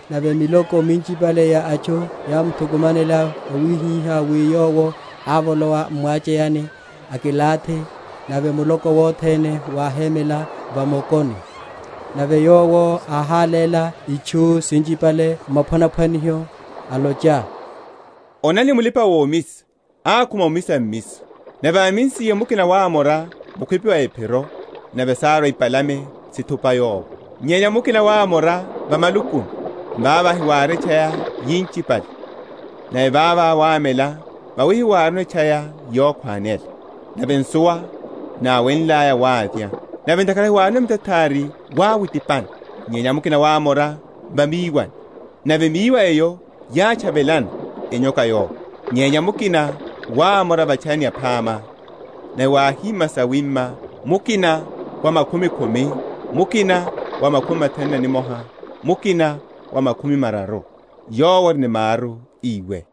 Nave miloko minchipale ya atchu yámthukumanela wawihihá wi Yowo ávolowa m’mwacheyani, akilathi, nave muloko wothene wáhémela va mokoni. Nave Yowo áháléla itchu sinchipale m’maphwanaphwaniho, alocha, Onani, mulipa‐omisa ákhuma omisa mmiso. Nave ámisiye, mukina wámora mukhwipi mwa ephiro, nave sárwa ipalame, sithupa yowo. Nyenya mukina wámora va malukuni, vavo havári etchaya yinchipale; nave vavo wámela, vawi hawárino etchaya yokhwanela. Nave nsuwa náwenlaya wávya; nave ntakhara hawárino mitathari wáwitipana. Nyenya mukina wámora va míwani, nave míwa eyo yátchavelana, enyoka yowo. Nyenya mukina wámora va’tchayani yaphama, nave wáhima sawima, mukina wa makhumi khumi, mukina wa makhumi mathanu na nimoha, mukina wa makhumi mararu. Yowo ori ni maru, íwe.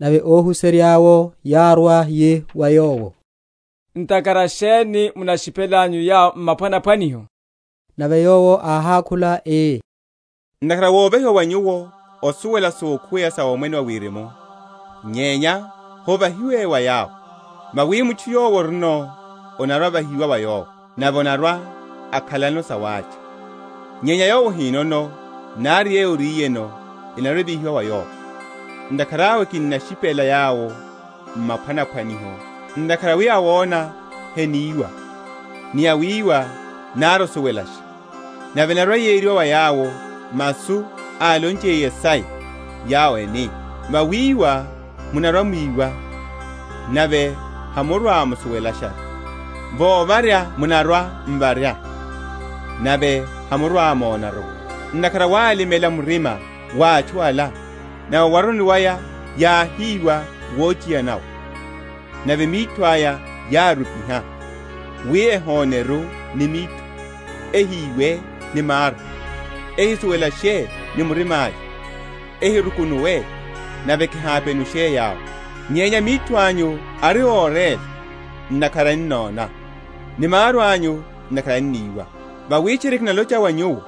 Nave óhuserya’wo yárwa, yi wa Yowo, Ntakhara sheni munashipelanyu yawo m’maphwanaphwaniho? Nave Yowo áhákhula ii, Ntakhara wovahiwa wa nyuwo osuwela sokhuweya sa Omwene wa Wirimu, nyenya hovahiwe wa yawo. Vawi mutchu yowo orino, onarwa‐ovahiwa wa yowo, nave anarwa‐akhalano sawácha; nyenya yowo ahinono, nari yeyo oriyeno enarwa‐evihiwa wa yowo. Ntakhara awe kinnashipela yawo m’maphwanaphwaniho; ntakhara wi awona heniwa, ni awíwa, nari osuwelasha. Nave enarwa‐yeriwa wa yawo masu álonchiye Yesaya, yawo eni, Vawíwa munarwa‐mwíwa, nave hamurwa‐musuwelasharu; Vovarya munarwa‐m’varya, nave hamurwa‐monaru; Ntakhara wálimela murima wa atchu ala, Nave owaruni waya yáhíwa wochiyana’wo, Nave mitho aya yárupiha; Wi ehoneru ni mitho, Ehiwe ni maru, Ehisuwelashe ni murima’ya, Ehirukunuwe, Nave kihapenushe yawo. Nyenya mitho anyu ari óréla, ntakhara ennona; ni maru anyu ntakhara enníwa. Vawi tchiri kinalocha wa nyuwo,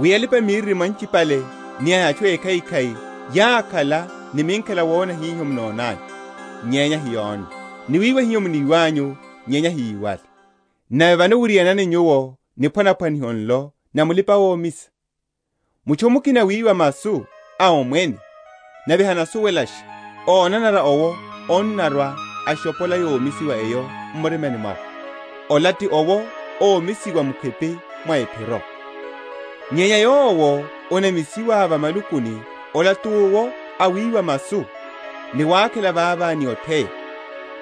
wi alipa‐miririmo anchipale ni atchu ékhaikhai yákhala ni minkhela wona hiho munonanyu, nyenya hayónne; ni wiwa hiho muniwanyu, nyenya hayíwale. Nave vano wiryanani nyuwo niphwanaphwaniho nlo na mulipa‐omisa. Mutchu mukina awíwa masu a Omwene, nave hanasuwelasha, ónanara owo annarwa, ashophola yomisiwa eyo m’murimani mwawe. Ola ti owo ómisiwa mukhwipi mwa ephiro. Nyenya yowo anamisiwa va malukuni, ola ti owo awíwa masu, ni wákhela vava ni otheya;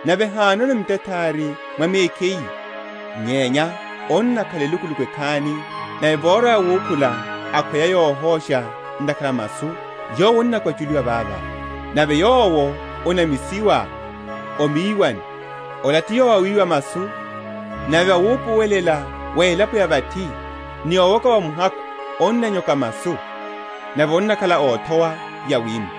nave hánono mitathari mwa mekhiye, nyenya annakhala elukuluku ekhani; nave vorwa yawukhula akhweya yohosha ntakhara a masu, yowo annakwachuliwa vava. Nave yowo anamisiwa o miwani, ola ti yowo awíwa masu; nave wupuwelela wa elapo ya vathi, ni owoka wa muhakhu onnanyoka masu: nave onnakhala othowa yawima.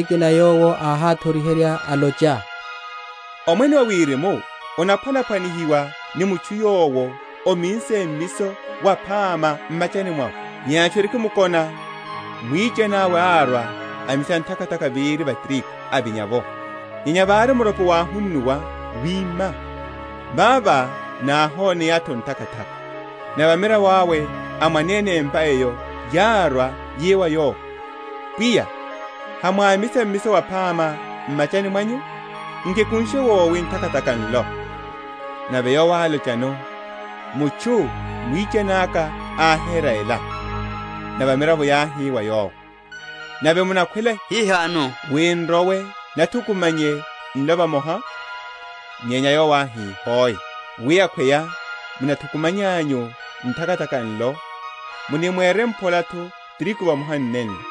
Niphwanaphwaniho nikina Yowo áháthoriherya, alocha, Omwene wa Wirimu onaphwanaphwanihiwa ni mutchu, yowo ámminse mmiso waphama m’machani mwawe; nyenya atchu erikimkona, mwichani awe árwa, amisa nthakathaka véri va tirigu, avinya’vo. Nyenya vári muropo wáhunnuwa, wima, vavo náhoneya’tho nthakathaka. Nave amiravo awe a mwanene empa eyo, yárwa, yi wa yowo, Pwiya, hamwámisa mmiso waphama m’machani mwanyu? nki ekunshe wowi nthakathaka nlo? Nave yowo álochano, Mutchu mwichani aka ohera ela. Nave amiravo yáhi wa yowo, Nave munakhwela hihano wi n’rowe, nathukumanye nlo vamoha? Nyenya yowo áhi, Hoe, wi akhweya munathukumanyanyu nthakathaka nlo, munirimphola’tho tirigu vamoha ni nenlo.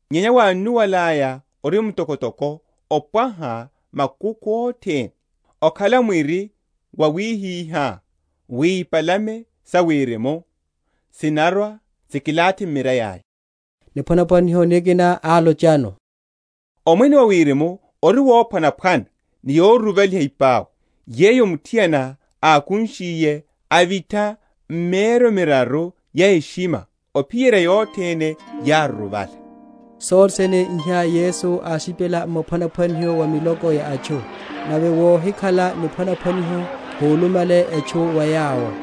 nyenya wánnuwalaya, ori mtokotoko opwaha makukhu othene, okhala mwiri, wawihihá wi ipalame sa wirimu sinnarwa, sikilathi m’mirai aya. Niphwanaphwaniho nikina álochano; Omwene wa Wirimu ori wophwanaphwana ni yoruruvaliha ipau, yeyo muthiana ákunshiye, avitha m’mieryo miraru ya eshima, ophiyerya yothene yáruruvala. Sothe sene iha Yesu áshipela m’maphwanaphwaniho wa miloko ya atchu; nave wohikhala niphwanaphwaniho húlumale etchu wa yawo: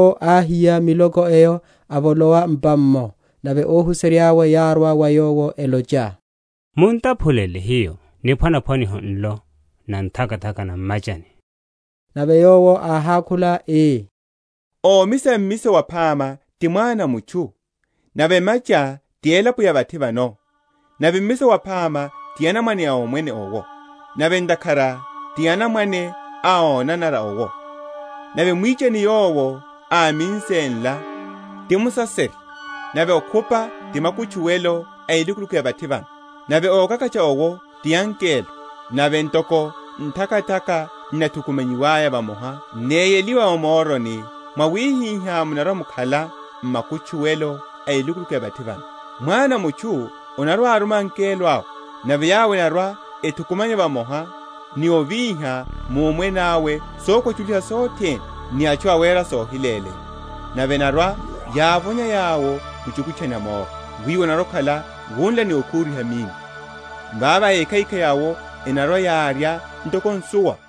Vavo Yowo áhiya miloko eyo, avolowa m’pa’mmo: nave óhuserya’we yárwa wa Yowo, elocha, Mun’taphulele hiyo niphwanaphwaniho nlo na nthakathaka na m’machani. Nave Yowo áhákhula ii, Omisa mmiso waphama ti Mwana a mutchu; nave emacha ti elapo ya vathi vano; nave mmiso waphama ti anamwane a Omwene owo; nave nthakathaka ti anamwane a ónanara owo; nave mwichani yowo áminse nla, ti Musaserya: nave okhupa ti makutchuwelo a elukuluku ya vathi vano; nave ókakatcha’wo ti angelo. Nave ntoko nthakathaka n’nathukumanyiwa vamoha, néyeliwa va moroni; mwawihihá munarwa‐mukhala m’makutchuwelo a elukuluku ya vathi vano. Mwana a mutchu anarwa‐aruma angelo awe, nave yawo enarwa‐ethukumanya vamoha, ni ovíha mu Omwene awe sokwachuliha sothene, ni atchu awera sohileleya, nave enarwa‐yávonya yawo mu chukutchani a moro; wiwo onarwa‐okhala wunla ni okhuriha minno. Vavo ékhaikhai awo enarwa‐yárya ntoko nsuwa,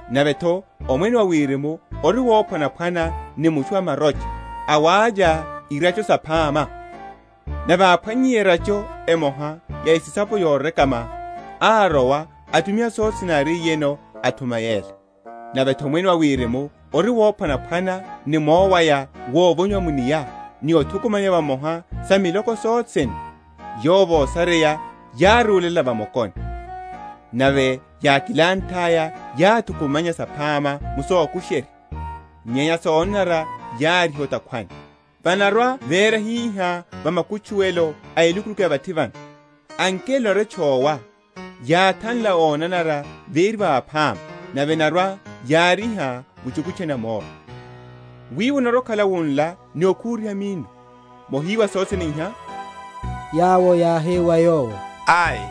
Nave’tho Omwene wa Wirimu ori wophwanaphwana ni mutchu a marocha, awávya irácho saphama: nave áphwannyiye erácho emoha ya esisapo yorekama, árowa, atumiha sothe sene áriyeno, athuma yela. Nave’tho, Omwene wa Wirimu ori wophwanaphwana ni mowaya wovonyiwa mu’nia, ni othukumanya vamoha sa miloko yothene, yowo vosareya, yárúlela va mokoni; nave yákilanthaya, yáthukumanya saphama m’soku?-?sherya, nyenya sonanara yáriha o’takhwani. Vanarwa‐véra hihá va makutchuwelo a elukuluku ya vathi vano: angelo enarwa‐etchowa, yáthanla ónanara véri va aphama, nave enarwa‐yáriha mu chukutchani a moro: wiwo onarwa‐okhala wunla ni okhuriha minno. Mohiwasha sothe sene iha? Yawo yáhi wa Yowo, Ai.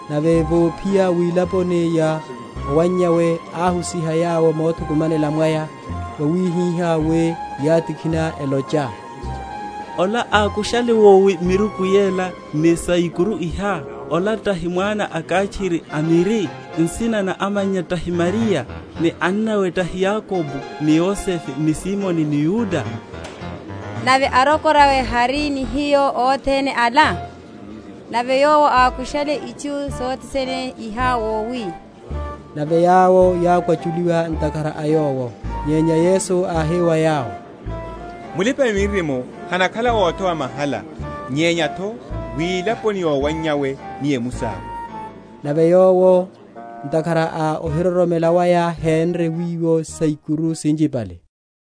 Nave vophiya wilaponi ya owannyawe, áhusiha yawo mothukumanela mwaya, wawihihá wi yátikhina, elocha, Ola ákushale wowi miruku yela ni saikuru iha? Ola tahi mwana a kháchiri a miri? nsina na amannya tahi Mariya? ni annawe tahi Yakobo ni Yosefe ni Simoni ni Yuda? Nave arokorawe hari ni hiyo othene ala? Nave Yowo ákushale itchu sothe sene iha wowi? Nave yawo yákwachuliwa ntakhara a Yowo. Nyenya Yesu áhi wa yawo, Mulipa‐miririmo hanakhala othowa mahala nyenya’tho wilaponi ya owannyawe ni o emusi awe. Nave Yowo, ntakhara a ohiroromela waya, hénre wiwo saikuru sinchipale.